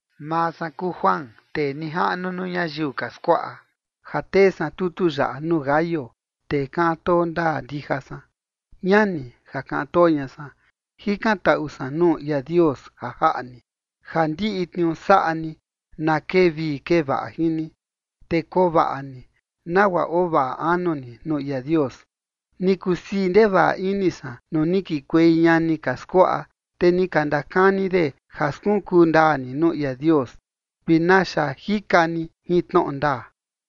Maa san kuu Juan, tee nijaꞌnu nuu ñayiu ka skuaꞌa, ja tee san tutu yaꞌa nuu Gayo, tee kaꞌan too ndaa ndija san. Ñani ja kaꞌan too ña san, jikantaꞌu san nuu ia Dios ja jaꞌa ni, ja ndiꞌi tniuu saꞌa ni na kee vii kee vaꞌa jin ni, te koo vaꞌa ni, nagua oo vaꞌa anu ni nuu ia Dios. Ni kusii ndevaꞌa ini san nuu ni kikuei ñani ka skuaꞌa, te ni ka ndakani de ja skunkuu ndaa ni nuu ia Dios vi naxa jika ni jin tnoꞌo ndaa.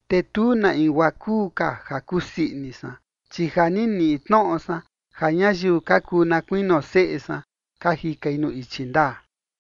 Te tu na in guaa kuu ka ja kusii ini san, chi ja ni niꞌi tnoꞌo san ja ñayiu ka kuu na kuinio seꞌe san ka jikai nuu ichi ndaa.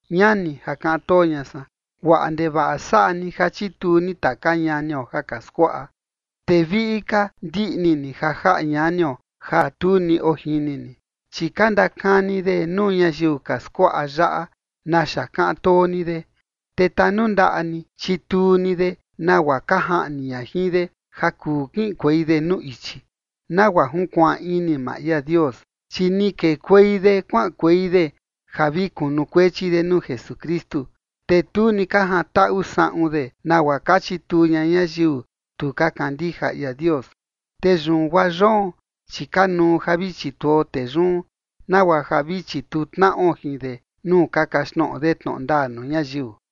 Ñani ja kaꞌan too ña san, guaꞌa ndevaꞌa saꞌa ni ja chituu ni taka ñanio ja ka skuaꞌa, te viꞌi ka ndiꞌni ni ja jaꞌa ñanio ja tu ni ojini ni. Chi ka ndakani de nuu ñayiu ka skuaꞌa yaꞌa naxa kaꞌan too ni de. Te tanundaꞌa ni chituu ni de nagua ka jaꞌni ña jin de ja kuu kiꞌinkuei de nuu ichi, nagua junkuaan ini maa ia Dios. Chi ni kekuei de kuaꞌankuei de ja vi kunukuechi de nuu Jesukristu, te tu ni ka jantaꞌu saꞌun de nagua ka chituu ña ñayiu tu ka kandija ia Dios. Te yun guaa yoon, chi kanuu ja vi chituo tee yun, nagua ja vi chituu tnaꞌo jin de nuu ka kaxtnoꞌo de tnoꞌo ndaa nuu ñayiu.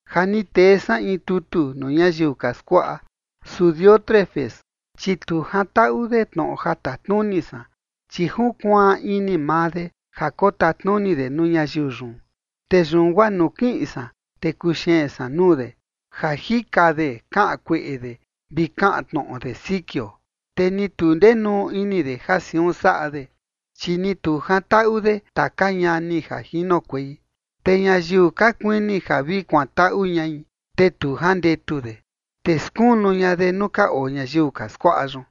Ja ni tee san in tutu nuu ñayiu ka skuaꞌa, su Diótrefes, chi tu jantaꞌu de tnoꞌo ja tatnuni san, chi junkuaan ini maa de ja kotatnuni de nuu ñayiu yun. Te yun guaa nuu kiꞌin san, te kuxeen san nuu de, ja jika de kaꞌan kueꞌe de vi kaꞌan tnoꞌo de sikio. Te ni tu ndenuu ini de ja siun saꞌa de, chi ni tu jantaꞌu de taka ñani ja jinokuei, te ñayiu ka kuini ja vi kuantaꞌu ñai, te tu jandetu de, te skunu ña de nuu ka oo ñayiu ka skuaꞌa yun.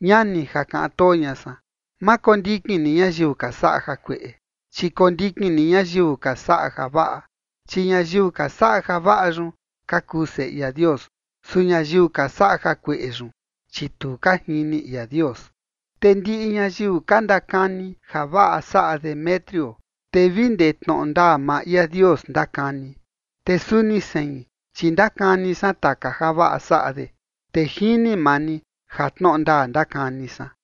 Ñani ja kaꞌan too ña san, ma kondikin ni ñayiu ka saꞌa jakueꞌe, chi kondikin ni ñayiu ka saꞌa javaꞌa. Chi ñayiu ka saꞌa javaꞌa yun ka kuu seꞌe ia Dios, su ñayiu ka saꞌa jakueꞌe yun, chi tu ka jini ia Dios. Te ndiꞌi ñayiu ka ndakani javaꞌa saꞌa Demetrio, te vi ndee tnoꞌo ndaa maa ia Dios ndakani. Te suni sein, chi ndakani san taka javaꞌa saꞌa de, te jini maa ni ja tnoꞌo ndaa ndakani san.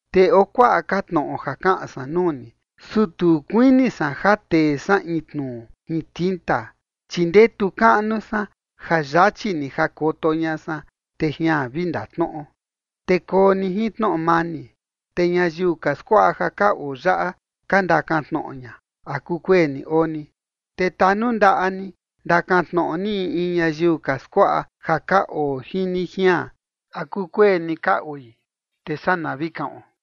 Te oo kuaꞌa ka tnoꞌo ja kaꞌan san nuu ni, su tu kuini san ja tee san in tnuu jin tinta. Chi ndetu kaꞌnu san ja yachi ni jakoto ña san, te jian vi ndatnoꞌo. Te koo ni jin tnoꞌo mani. Te ñayiu ka skuaꞌa ja ka oo yaꞌa ka ndakan tnoꞌo ña, ¿a kukueni oo ni? Te tanundaꞌa ni ndakan tnoꞌo ni in in ñayiu ka skuaꞌa ja ka oo jin ni jian, ¿a kukueni ka oi?, te saa na vi kaꞌon.